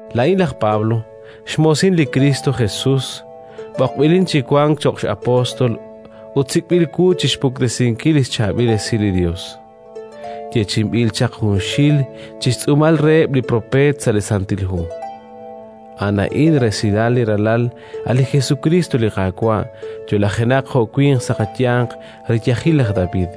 Laa'in laj Pablo, xmoosin li Kristo Jesus, b'oqb'ilin chi wank cho'q apóstol ut sik'b'il wu chi xpuktesinkil li xChaab'il Esil li Yos yeechi'inb'il chaq junxil chi xtz'uumal reheb' li xpropeet sa' li Santil Hu. A'an a'in resilal li Ralal, a' li Jesukriist li Qaawa', yo'lajenaq jo' winq sa' xyanq riyajil laj David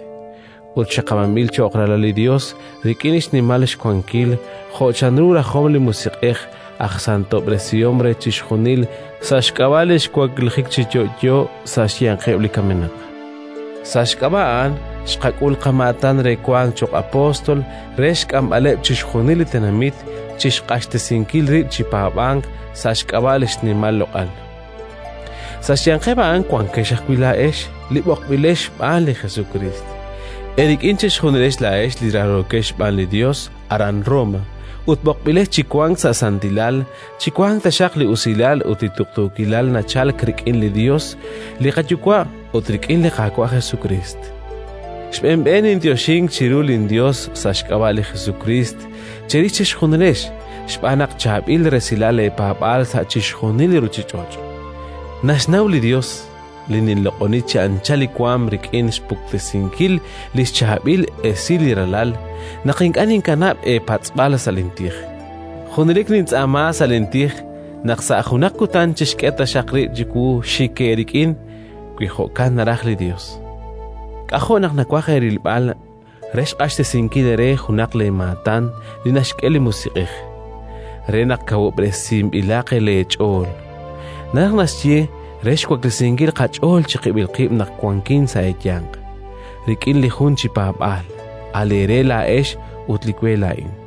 ut xaqab'anb'il cho'q Ralal li Yos rik'in xnimal xwankil, jo' chanru rajom li Musiq'ej aj santob'resihom re chixjunil, sa' xk'ab'a' li xwaklijik chi yo'yo sa' xyanqeb' li kamenaq. Sa' xk'ab'a' A'an xqak'ul qamaatan re wank cho'q apóstol re xk'amb'aleb' chixjunil li tenamit chi xq'axtesinkil rib' chi paab'ank sa' xk'ab'a' li xnimal xloq'al. Sa' xyanqeb' a'an wankex ajwi' laa'ex li b'oqb'ilex xb'aan li Jesukriist. Eerik'in chejunilex laa'ex li raarookex xb'aan li Yos aran Roma ut b'oqb'ilex chi wank sa' santilal chiwanq taxaq li usilal ut li tuqtuukilal nachalk rik'in li Yos li qaYuwa' ut rik'in li Qaawa' Jesukriist. Xb'een xb'een ninyoxink chiru linYos sa' xk'ab'a' li Jesukriist cherix chejunilex xb'aan naq chaab'il resilal leepaab'aal sa' chixjunil li ruuchich'och'. Naxnaw li Yos, li ninloq'oni chi anchal li waanm rik'in xpuktesinkil li xChaab'il Esil li Ralal, naq ink'a' ninkanab' eepatz'b'al sa' lintij. Junelik nintz'aama sa' lintij naq sa' junaq kutan chixk'e taxaq rib' chiwu xik eerik'in, wi jo'kan naraj li Yos. K'ajo' naq nawaj eerilb'al re xq'axtesinkil eere junaq leemaatan li naxk'e li Musiq'ej, re naq kawub'resinb'ilaq leech'ool, naraj naxye re xwaklesinkil qach'ool chiqib'il qib' naq wanqin sa' eeyanq, rik'in li jun chi paab'aal, a' leere laa'ex ut li we laa'in.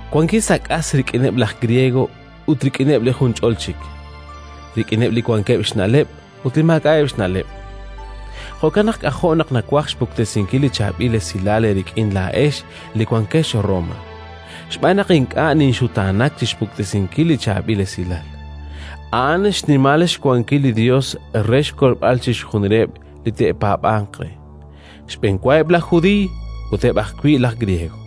Wankin sa' k'as rik'ineb' laj Griego ut rik'ineb' li junch'ol chik, rik'ineb' li wankeb' xna'leb' ut li maak'a'eb' xna'leb'. Jo'kan naq k'ajo' naq nawaj xpuktesinkil li Chaab'il Esilal eerik'in laa'ex li wankex Roma. Xb'aan naq ink'a' ninxutaanak chi xpuktesinkil li Chaab'il Esilal; a'an xnimal xwankil li Yos re xkolb'al chixjunileb' li te'paab'anq re: xb'enwa eb' laj Judiiy ut eb' ajwi' laj Griego.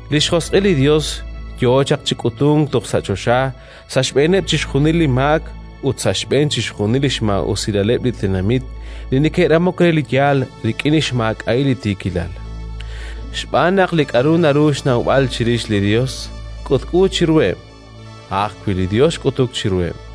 Li xjosq'il li Yos yo chaq chi k'utunk toj sa' choxa sa' xb'eeneb' chixjunil li maak ut sa' xb'een chixjunil li xmaa'usilaleb' li tenamit li neke'ramok re li yaal rik'in xmaak'a'il li tiikilal. Xb'aan naq li k'aru naru xnawb'al chirix li Yos, k'utk'u chiruheb': a' ajwi' li Yos xk'utuk chiruheb'.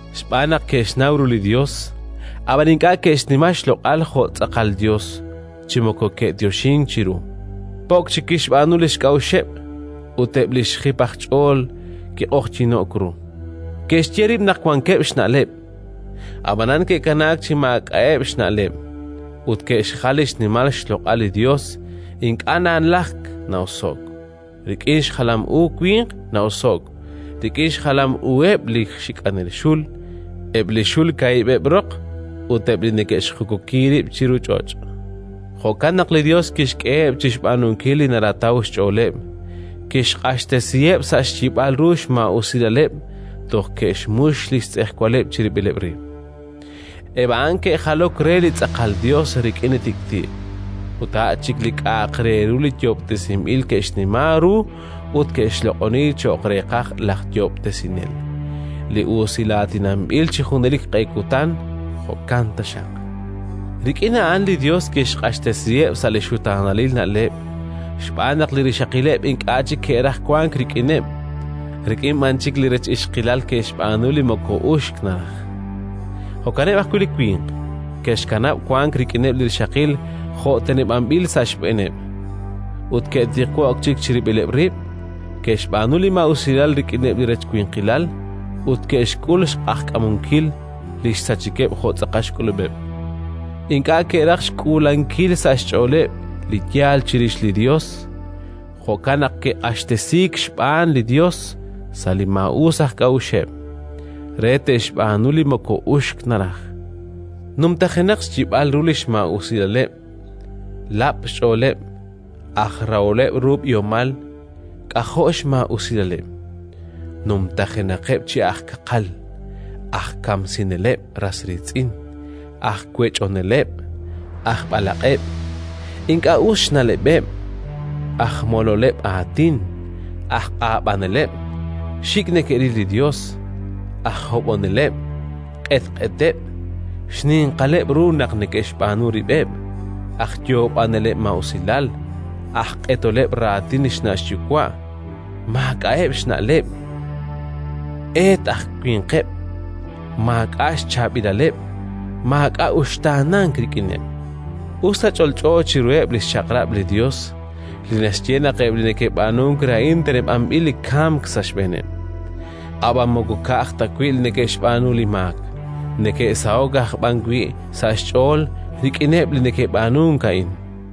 xb'aan naq ke'xnaw ru li Yos, ab'an ink'a' ke'xnima xloq'al jo' tz'aqal Yos chi moko ke'yoxink chiru, po'k chik kixb'aanu li xk'a'uxeb', ut eb' li xjip aj ch'ool kiq'oqyino'k ru. Ke'xye rib' naq wankeb' xna'leb', ab'anan ke'kanaak chi maak'a'eb' xna'leb', ut ke'xjal li xnimal xloq'al li Yos ink'a' nalajk na'oso'k rik'in xjalam u winq na'oso'k, rik'in xjalam uheb' li xik'anel xul, eb' li xul kaahib'eb' roq ut eb' li neke'xjukuki rib' chiru ch'och'. Jo'kan naq li Yos kixk'eheb' chi xb'aanunkil li narataw xch'ooleb', kixq'axtesiheb' sa' xyib'al ru xmaa'usilaleb' toj ke'xmux li xtz'ejwaleb' chirib'ileb' rib': eb' a'an ke'jalok re li tz'aqal Yos rik'in li tik'ti', ut a' chik li k'a'aq re ru yoob'tesinb'il ke'xnima ru ut ke'xloq'oni cho'q reeqaj laj Yoob'tesinel, li usilaatinanb'il chi junelik q'e kutan. Jo'kan taxaq. Rik'in a'an li Yos kixq'axtesiheb' sa' li xutaanalil na'leb' xb'aan naq li rixaqileb' ink'a' chik ke'raj wank rik'ineb', rik'in b'an chik li rech ixqilal ke'xb'aanu li moko uxk naraj. Jo'kaneb' ajwi' li winq: ke'xkanab' wank rik'ineb' li rixaqil jo' teneb'anb'il sa' xb'eeneb', ut ke'tiqwo'k chik chirib'ileb' rib'; ke'xb'aanu li maa'usilal rik'ineb' li rech winqilal ut ke'xk'ul xq'ajkamunkil li xsachikeb' jo' tz'aqal xk'ulub'eb'. Ink'a' ke'raj xk'uulankil sa' xch'ooleb' li yaal chirix li Yos, jo'kan naq ke'q'axtesiik xb'aan li Yos sa' li xmaa'us aj k'a'uxeb' re te'xb'aanu li moko uxk naraj. Numtajenaq xyib'al ru li xmaa'usilaleb', lab' xch'ooleb', aj raholeb' ru b'ihomal, k'ajo' xmaa'usilaleb'; numtajenaqeb' chi aj kaqal, aj kamsineleb' ras riitz'in, aj wech'oneleb', aj b'alaq'eb', ink'a' us xna'leb'eb', aj mololeb' aatin, aj q'ab'aneleb', xik' neke'ril li Yos, aj hob'oneleb', q'etq'eteb', xninqaleb' ru naq neke'xb'aanu rib'eb', aj yoob'aneleb' maa'usilal, aj q'etoleb' raatin xna' xyuwa', maak'a'eb' xna'leb', eet aj winqeb', maak'a' xchaab'ilaleb', maak'a' uxtaanank rik'ineb'. Us ta ch'olch'o chiruheb' li xchaq'rab' li Yos, li naxye naq eb' li neke'b'aanunk re a'in teneb'anb'il li kamk sa' xb'eeneb', ab'an moko ka'aj ta wi' neke'xb'aanu li maak, neke'saho'k aj b'an wi' sa' xch'ool rik'ineb' li neke'b'aanunk a'in.